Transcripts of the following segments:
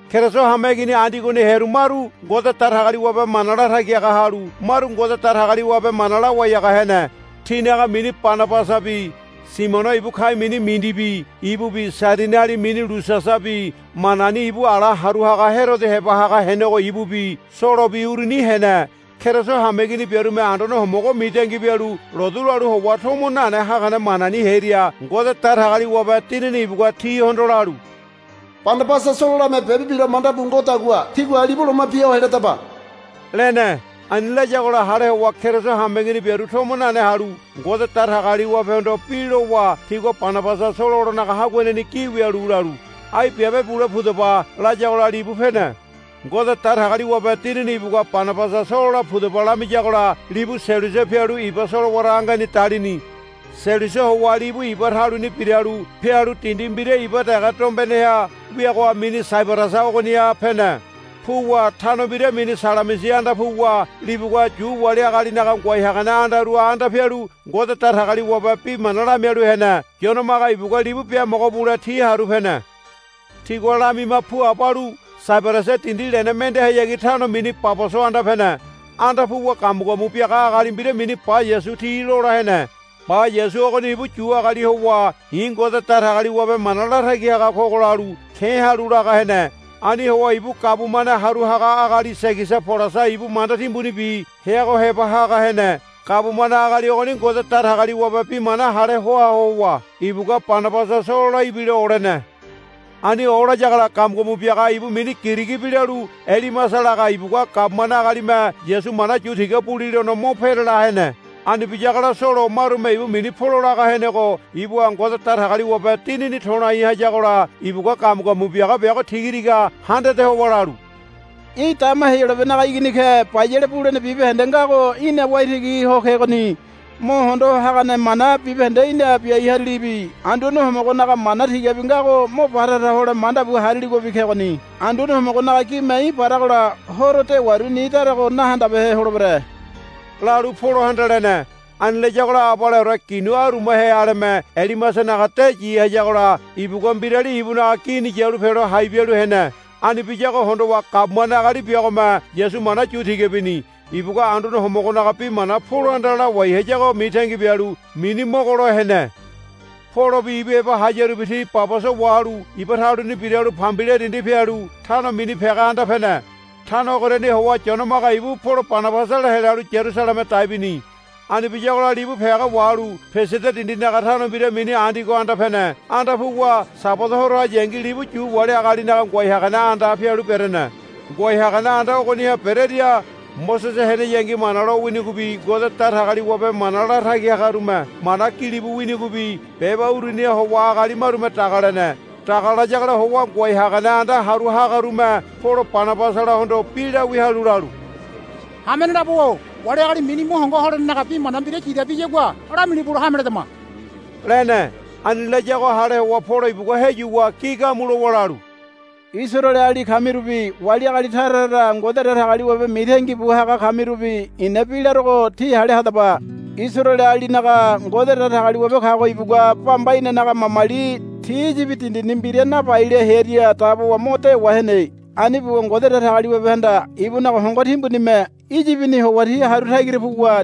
Keriso hameigini Andiogoni hearu maru Ngode Datagaliwabe mana latagi haga halu maru Ngode Datagaliwabe mana lawai haga hene. Tinaga mini Banabasabi Simiono ibu ka̱i̱ mini Mindibi ibubi Sairiniali mini Lusiasabi Manaini ibu ala haru haga Herodo heba haga henego ibubi Solobi uruni hene. Keriso hameigini biarume Anduane Homogo mitangi bialu lotu lalu howa tomo nane hagane manani hearia Ngode Datagaliwabe Dinini ibugua tihondo lalu, Banabasa Sololame biabe bilo lo manda bu ngodagua tígua libu loma bia ho heladaba, lene. Ani layagola hale howa Keriso hameigini biaru tomo nane halu Ngode Datagaliwabehondo bi lowa tigua Banabasa Sololanaga haguaneni gi wialu lalu, Ai biabe bule pudaba, layagola libu pene. Ngode Datagaliwabe Dinini ibugua Banabasa Solola pudaba lamiyagola libu Selusia pialu iba solowara angeni dalini. Selusia howa libu iba taluni biralu pialu dindi mbira iba dege dombeneha wiago mini Saibarasa ogoniha pene. Puwa tano mbira mini Salamisi anda puwa libugua Yu wali agalinaga ngoai hagane andaruha anda pialu Ngode Datagaliwabe bi mana lamialu hene. Yone Maga ibugua libu biamogo bule ti haru pene. Tigua lamima puabo halu Saibarasa dindi lene mendehayagi tano mini Paboso anda pene. Anda puwa gamugamu biaga agali mbira mini Ba-Yasu ti lola hene. Ba-Yasu ogoni ibu Yu agali howa, I̱ Ngode Datagaliwabe mana latagi haga kogo, lalu ke̱ halu laga hene. Ani howa ibu gabumane haru haga agali Segiasa Polasa ibu manda timbunibi heago heba haga hene. Gabumane agali ogoni Ngode Datagaliwabe bi mana hale hoa howa ibugua Banabasa Solola ibilo olene. Ani olayagola gamugamu biaga ibu mini Girigi bi lalu Elimasa laga ibugua gabumane agalime Yasu mana yu tiga bulilono mo perela hene. Ani biyagola Solo marume ibu mini Polo laga henego ibuha Ngode Datagaliwabe Dinini to̱lai hayagola ibugua gamugamu biaga biago tiga tiga handade howa lalu, Í̠ dama Heyolabenaga igini ke. Bayale bulene bibahende ngago í̠na waitigi ho kegoni. Mo hondo hagane mana bibahende í̠na biai harilibi Anduane Homogonaga mana tigabi ngago mo batara hole manda bu hariligobi kegoni. Anduane Homogonaga gime í̠ baragola horo dewaru ni darago de nahandabehe holebere, lalu Polohanda lene. Ani layagola abaleore ginu arumahe aleme Elimasanaga de yi hayagola ibugua mbirali ibunaga gini yalu pelo hai bialu hene. Ani biyago hondowa gabumane agali biagome Yasu mana yu tiga bini. Ibugua Anduane Homogonaga bi mana Polohanda lawai hayago mitangi bialu mini mogolo hene. Polobi ibu heba hayarubi ti Paboso wahalu iba taluni biralu Pambilia dindi pialu tano mini Pega anda pene. Tano ogoriani howa Yone Maga ibu Polo Banabasala helalu Yarusaleme dai bini. Ani biyagola libu Pega wahalu Pisidia dindinaga tano mbira mini Andiogo anda pene. Anda puwa Sabada horo hayangi libu Yu wali agalinaga ngoai hagane andaha pialu berene. Ngoai hagane anda ogoniha berearia Mosese heneyangi Mana lo winigobi Ngode Datagaliwabe mana latagi hagarume mana gilibu winigobi beba uruniha howa agali marume dagalene. Dagalayagola howa ngoai hagane anda haru hagarume Polo Banabasalahondo bi lawia halu lalu, Hamene labo-o wali agali mini mo hongo holenenaga bi mana mbira yidabiyagua lamilibulo hame ledama, lene. Ani layago hale howa Polo ibugua heyuwa gi gamu lowa lalu, Isaraeleali kamirubi wali agali tara tara Ngode Datagaliwabe mitangi bu haga kamirubi i̱na bi larogo tí hale hadaba. Isaraelealinaga Ngode Datagaliwabe kago ibugua bamba inanaga mamali ti Iyibi dindini mbira nabaile hearia dabowa mo dewa hene. Ani buwa Ngode Datagaliwabehanda ibunaga hongo timbunime Iyibini howa ti haru tagira puwa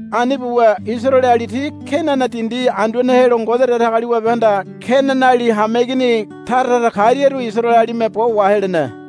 Ani buwa Isaraeleali ti Kenana dindi anduane helo Ngode Datagaliwabehanda Kenanali hameigini tara tara kariaru Isaraelealime bo wa helene.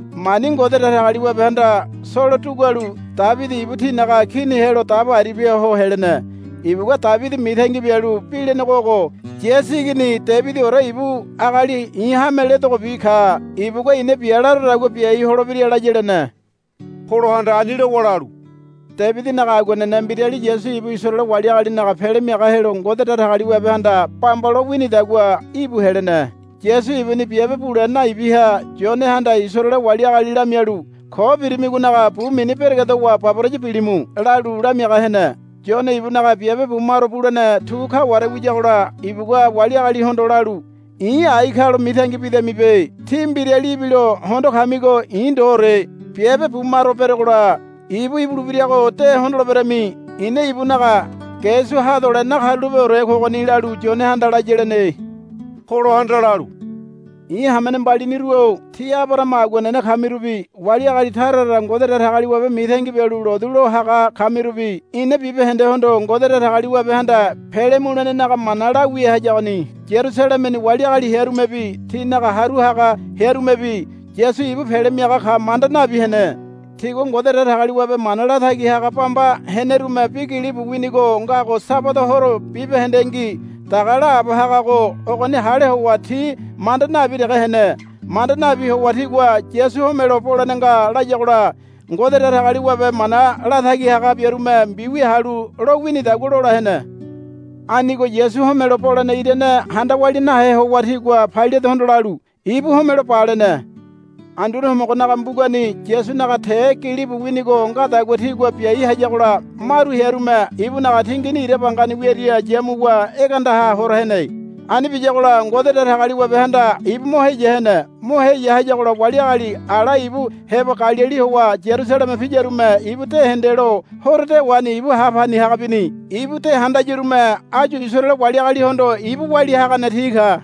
Mani Ngode Datagaliwabehanda Solo dugualu Debidi ibu tinaga kini helo dabo aribia ho helene. Ibugua Debidi mitangi bialu bi lenego ogo, Yasi igini Debidiore ibu agali i̱ hame ledogobi ka. Ibugua i̱na bia larodagua biaiore holebira, laya, lene. Polohanda ani lowa lalu, Debidinaga aguanene mbirali Yasu ibu Isaraele wali agalinaga Pele Miaga helo Ngode Datagaliwabehanda bamba lo winidagua ibu helene. Yasu ibuni biabe bule naibiha Yonehanda Isaraele wali agali lamialu, Ko birimigonaga bu mini beregedowa baboraya bilimu, lalu lamiaga hene. Yone ibunaga biabe bumaro bulene tu kaware wiyagola ibugua wali agalihondo lalu, I̱ ai ka lo mitangi bidamibe. Tí mbirali ibilo hondo kamigo i̱ ndoore. Biabe bumaro berogola ibu ibulebirago de hondoleberemi. I̱na ibunaga ge su hadole nakarulapeore kogoni, lalu Yonehanda laya, lene. Polohanda lalu, I̱ hamene mbaliniru-o tí Abarahama aguanene kamirubi wali agali tara tara Ngode Datagaliwabe mitangi bialu lotu lo haga kamirubi ina bibahendehondo Ngode Datagaliwabehanda pele mulenenaga mana lawia hayagoni. Yarusalemeni wali agali hearumebi tinaga haru haga hearumebi Yasu ibu Pele Miaga ka manda nabi hene. Tigua Ngode Datagaliwabe mana latagi haga bamba henerume bi gilibu winigo ngago Sabada horo bibahendengi daga laabo hagago ogoni hale howa ti manda nabi dege hene. Manda nabi howa tigua Yasu homelo bolene nga layagola Ngode Datagaliwabe mana latagi haga biarume mbiwia halu lo winidagua lola hene. Anigo Yasu homelo bolene irane handa walia nahe howa tigua Pailatehondo lalu, Ibu homelo ba, lene. Andune Homogonaga mbugani Yasunaga te gilibu winigo ngadagua tigua biai hayagola maru hearume ibunaga tingini ira bangani wiaria yamuwa egeandaha hora hene. Ani biyagola Ngode Datagaliwabehanda ibu mo heya hene. Mo heya hayagola wali agali ala ibu heba Galili howa Yarusaleme piyarume ibu de hendelo horo dewani ibu ha pani haga bini. Ibu de handayarume áyu Isaraele wali agalihondo ibu walia hagane ti ka.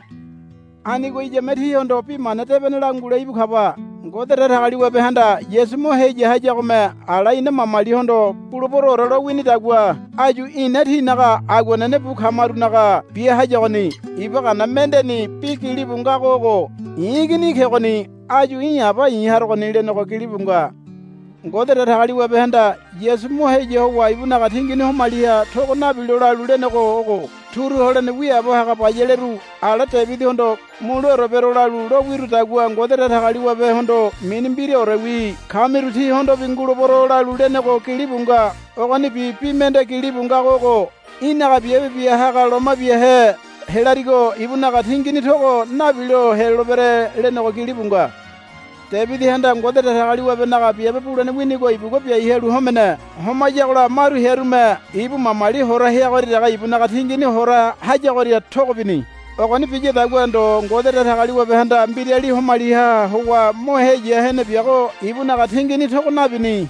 Anigo iyame tíhondo Bi Mana Debene langule íbu kaba. Ngode Datagaliwabehanda Yasu mo heya hayagome ala ina mamalihondo buleberoore lo winidagua áyu ina tinaga aguanene bu kamarunaga bia hayagoni. Iba Gana mendeni bi gilibu ngago ogo, I̱ igini í̠ kegoni. Áyu í̠ Aba i̱ harogoni, lenego gilibu nga. Ngode Datagaliwabehanda Yasu mo heya howa ibunaga tingini homaliha togo nabilo lalu lenego ogo, Turu holene wiaabo haga bayaleru ala Debidihondo muleore bero lalu lo wirudagua Ngode Datagaliwabehondo mini mbiraorewi kamiru tíhondobi ngulebero, lalu lenego gilibu nga. Ogonibi bi mende gilibu ngago ogo, Í̠naga biabe bia haga loma biahe helarigo ibunaga tingini togo nabilo helolebere, lenego gilibu nga. Debidihanda Ngode Datagaliwabenaga biabe bulene winigo ibugua biai halu homene. Homayagola maru hearume ibu mamali hora heagoria dege ibunaga tingini hora hayagoria togo bini. Ogoni biyadagua ndo Ngode Datagaliwabehanda mbirali homaliha howa mo heya hene biago ibunaga tingini togo nabini.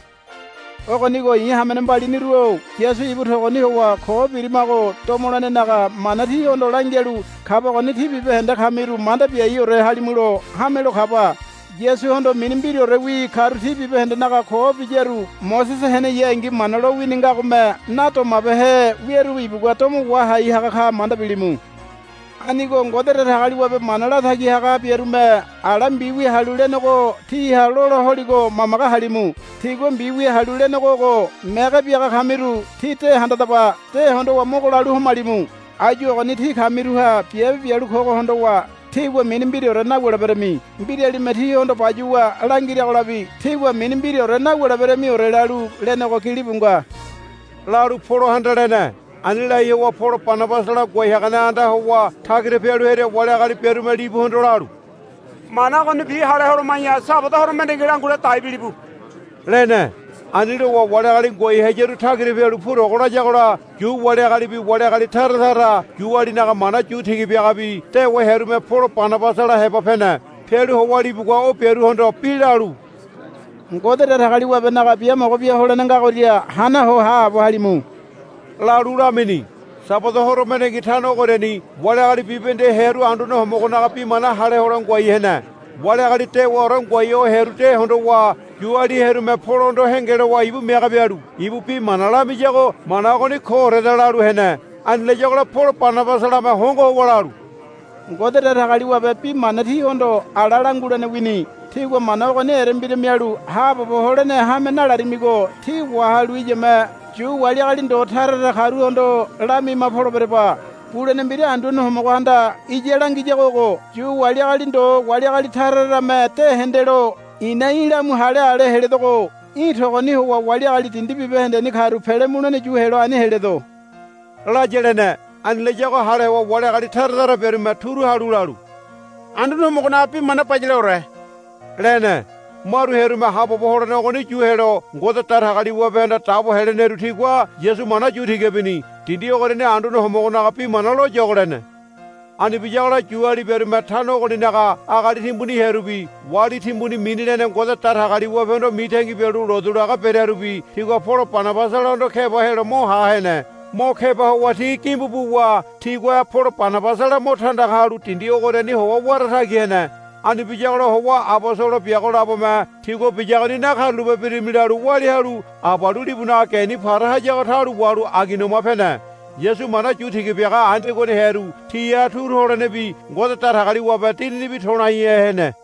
Ogonigo i̱ hamene mbaliniru-o Yasu ibu togoni howa ko birimago domolenenaga mana tíhondo langialu kabagoni tí bibahende kamiru manda biaiore halimulo hamelo kaba. Yasuhondo mini mbiraorewi karu ti bibahendenaga ko biyaru Mosese heneyangi Mana lowini ngagome nadomabehe wiaru ibugua domo wahai haga ka manda bilimu. Anigo Ngode Datagaliwabe mana latagi haga biarume ala mbiwia halu lenego tíha lola holigo mamage halimu. Tigua mbiwia halu lenego ogo, Mege biaga kamiru tí de handadaba. De hondowa mogo lalu homalimu. Áyu ogoni tí kamiruha biabe bialu kogo hondowa tígua mini mbiraore nawuleberami. Mbiralime tíhondo bayuwa langiragolabi tígua mini mbiraore nawuleberamiore, lalu lenego gilibu nga, lalu Polohanda lene. Ani lai howa Polo Banabasala ngoai hagane andaha howa tagira pialu hearia wali agali biarume libuhondo lalu, Mana ogonibi hale holoma̱ya Sabada horo mendengi langule dai bilibu, lene. Ani lowa wali agali ngoai hayaru tagira pialu purogo layagola Yu wali agalibi wali agali tara tara Yualinaga mana yu tiga biagabi dewa hearume Polo Banabasala heba pene. Pialu howa libugua o biaruhondo bi lalu, Ngode Datagaliwabenaga biamogo bia holene ngagoria hana ho haabo halimu, lalu lamini. Sabada horo mendengi tano ogoriani wali agali bibahende hearu Anduane Homogonaga bi mana hale hole ngoai hene. Wali agali dewaore ngoai ho hearu de hondowa Yuali hearume Polohondo henge lowa ibu mege bialu ibu bi mana lamiyago, Mana ogoni kooreda, lalu hene. Ani layagola Polo Banabasalame hongo howa lalu, Ngode Datagaliwabe bi mana tíhondo ala langulene wini. Tígua mana ogoni erembira mialu haabobo holene hame nalarimigo tí wahalu iyame Yu wali agali ndo tara tara karuhondo lamima poleberaba. Bulene mbira Anduane Homogohanda iya langiyago ogo, Yu wali agali ndo wali agali tara tarame de hendelo i̱na í̠ lamu hale ale heledogo. Í̠ togoni howa wali agali dindi bibahendeni karu pele mulene yu helo ani heledo, laya, lene. Ani layago hale howa wali agali tara tara biarume turu halu lalu, Anduane Homogonaga bi mana bayaleore, lene. Maru hearume haabobo holene ogoni yu helo Ngode Datagaliwabehanda dabo heleneru tigua Yasu mana yu tiga bini. Dindi ogoriani Anduane Homogonaga bi mana loyogo lene. Ani biyagola Yuali biarume tano ogoninaga agali timbuni hearubi wali timbuni mini lene Ngode Datagaliwabehondo mitangi bialu lotu laga berearubi tigua Polo Banabasalahondo keba helo mo ha hene. Mo keba howa ti gimbu buwa tigua Polo Banabasala mo tandaga halu dindi ogoriani howa wara tagi hene. Ani biyagola howa abosolo biago labome tigua biyagoni nakarulape birimi lalu walia halu abalu libunaga geni para hayago taulo wahalu Aigoniama pene. Yasu mana yu tiga biaga Andiogoni hearu tiha turu holenebi Ngode Datagaliwabe Dininibi to̱laihe hene.